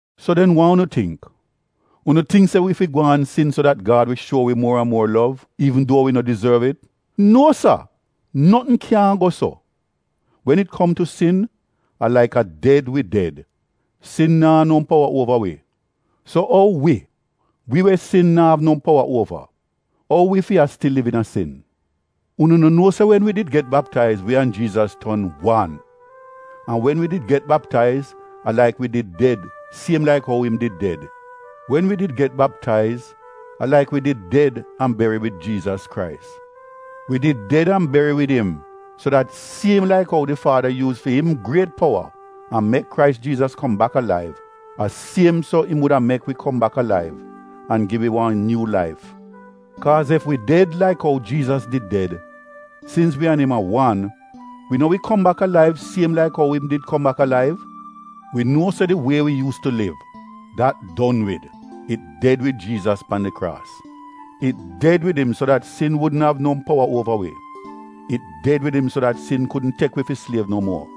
So den wa unu tingk? Unu tingk se wi fi gwaan sin so dat Gad wi shuo wi muor an muor lov, iivn duo wi no dizorv it? Nuo sa, notn kyaahn go so! Wen it kom tu sin, a laik a ded wi ded, sin naa no powa uova wi. So ou wi, wi we sin naa no powa uova, ou wi fi a stil liv iina sin? Unu no nuo se wen wi did get baptaiz, wi an Jiizas ton wan? An wen wi did get baptaiz a laik wi did ded siem laik ou im did ded. Wen wi did get baptaiz, a laik wi did ded an beri wid Jiizas Krais. Wi did ded an beri wid im so dat siem laik ou di Faada yuuz fi im griet powa an mek Krais Jiizas kom bak alaiv, a siem so im wuda mek wi kom bak alaiv an gi wi wan nyuu laif. Kaaz ef wi ded laik ou Jiizas did ded, sins wi an im a wan, wi no wi kom bak alaiv siem laik ou im did kom bak alaiv? Wi nuo se di wie wi yuus tu liv, dat don wid — it ded wid Jiizas pan di kraas. It ded wid im so dat sin wudn av no powa uova wi. It ded wid im so dat sin kudn tek wi fi sliev no muor.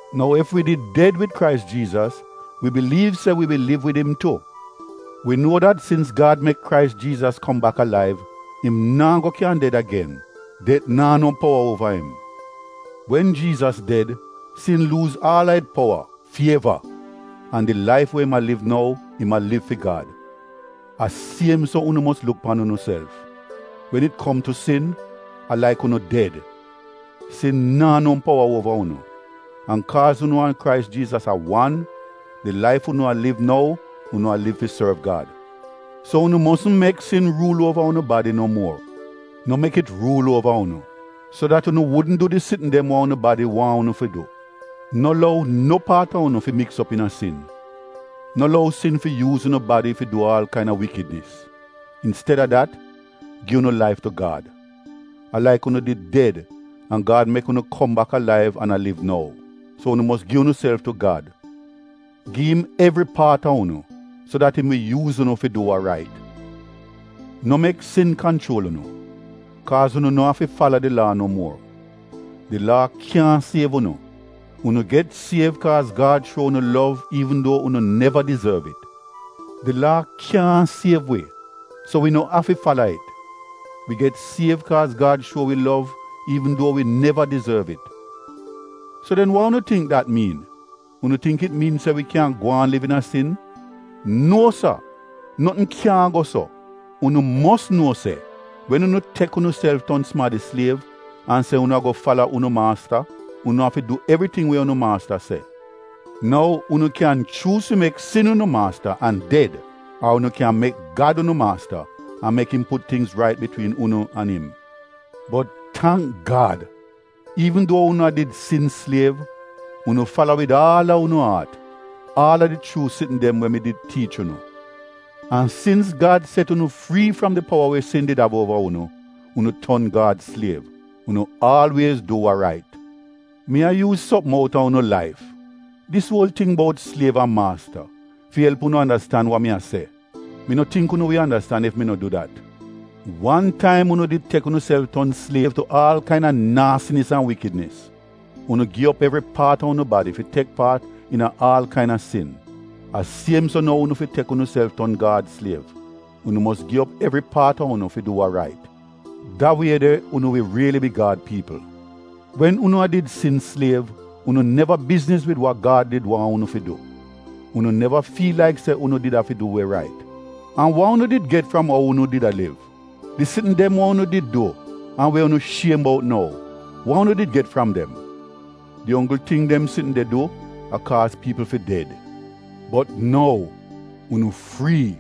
Nou ef wi did ded wid Krais Jiizas, wi biliiv se wi wi liv wid im tu. Wi nuo dat sins Gad mek Krais Jiizas kom bak alaiv im naa go kyan ded agen — det naa no powa uova im. Wen Jiizas ded, sin luuz aal a it powa fi eva, an di laif we im a liv nou, im a liv fi Gad. A siem so unu mos luk pan unuself, wen it kom tu sin, a laik unu ded, sin naa no powa uova unu. An kaaz unu an Krais Jiizas a wan, di laif unu a liv nou, unu a liv fi sorv Gad. So unu mosn mek sin ruul uova unu badi no muor. No mek it ruul uova unu, so dat unu wudn du di sitn dem wa unu badi waahn unu fi du. No lou no paat a unu fi miks op iina sin. No lou sin fi yuuz unu badi fi du aal kaina wikidnis. Insteda dat, gi unu laif tu Gad. A laik unu did ded an Gad mek unu kom bak alaiv an a liv nou. So unu mos gi unuself tu Gad. Gi im evri paat a unu so dat im wi yuuz unu fi du wa rait. No mek sin kanchuol unu, kaaz unu no afi fala di Laa no muor. Di laa kyaahn siev unu. Unu get siev kaaz Gad shuo unu lov iivn duo unu neva dizorv it. Di Laa kyaahn siev wi, so wi no afi fala it. Wi get siev kaaz Gad shuo wi lov iivn duo wi neva dizorv it. So den wa unu tingk dat miin? Unu tingk it miin se wi kyan gwaan liv iina sin? Nuo sa! Notn kyaahn go so! Unu mos nuo se, wen unu tek unuself ton sumadi sliev an se unu ago fala unu maasta, unu afi du evriting we unu maasta se. Nou unu kyan chuuz fi mek sin unu maasta an ded ar unu kyan mek Gad unu maasta an mek im put tingz rait bitwiin unu an im. Bot tangk Gad, iivn duo unu a did sin sliev, unu fala wid aal a unu aat, aal a di chuu sitn dem we mi did tiich unu. An sins Gad set unu frii fram di powa we sin did av uova unu, unu ton Gad sliev — unu aalwiez du wa rait. (Mi a yuuz sopm outa unu laif, dis uol ting bout sliev an maasta, fi elp unu andastan wa mi a se. Mi no tingk unu wi andastan ef mi no du dat.) Wan taim unu did tek unuself ton sliev tu aal kaina naasinis an wikidnis — unu gi op evri paat a unu badi fi tek paat iina aal kaina sin. A siem so nou unu fi tek unuself ton Gad sliev — unu mos gi op evri paat a unu fi du wa rait. Da wie de unu wi riili bi Gad piipl. Wen unu a did sin sliev, unu neva bizniz wid wa Gad did waahn unu fi du — unu neva fiil laik se unu did afi du we rait. An wa unu did get fram ou unu did a liv? Di sitn dem we unu did du an we unu shiem bout nou, wa unu did get fram dem? Di onggl ting dem sitn de du, a kaaz piipl fi ded. Bot nou, unu frii.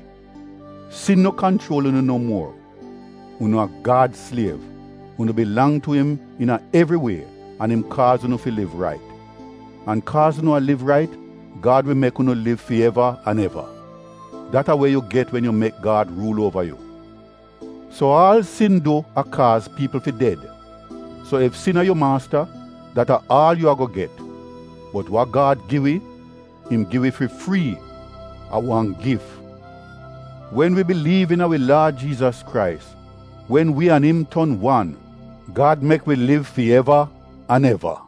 Sin no kanchuol unu no muor. Unu a Gad sliev, unu bilang tu im iina evri wie an im kaaz unu fi liv rait. An kaaz unu a liv rait Gad wi mek unu liv fi eva an eva. Dat a we yu get wen yu mek Gad ruul uova yu. So aal sin du a kaaz piipl fi ded. So ef sin a yu maasta dat a aal yu ago get. Bot wa Gad gi wi, im gi wi fi frii — a wan gif. Wen wi biliiv iina wi Laad Jiizas Krais, wen wi an im ton wan, Gad mek wi liv fi eva an eva.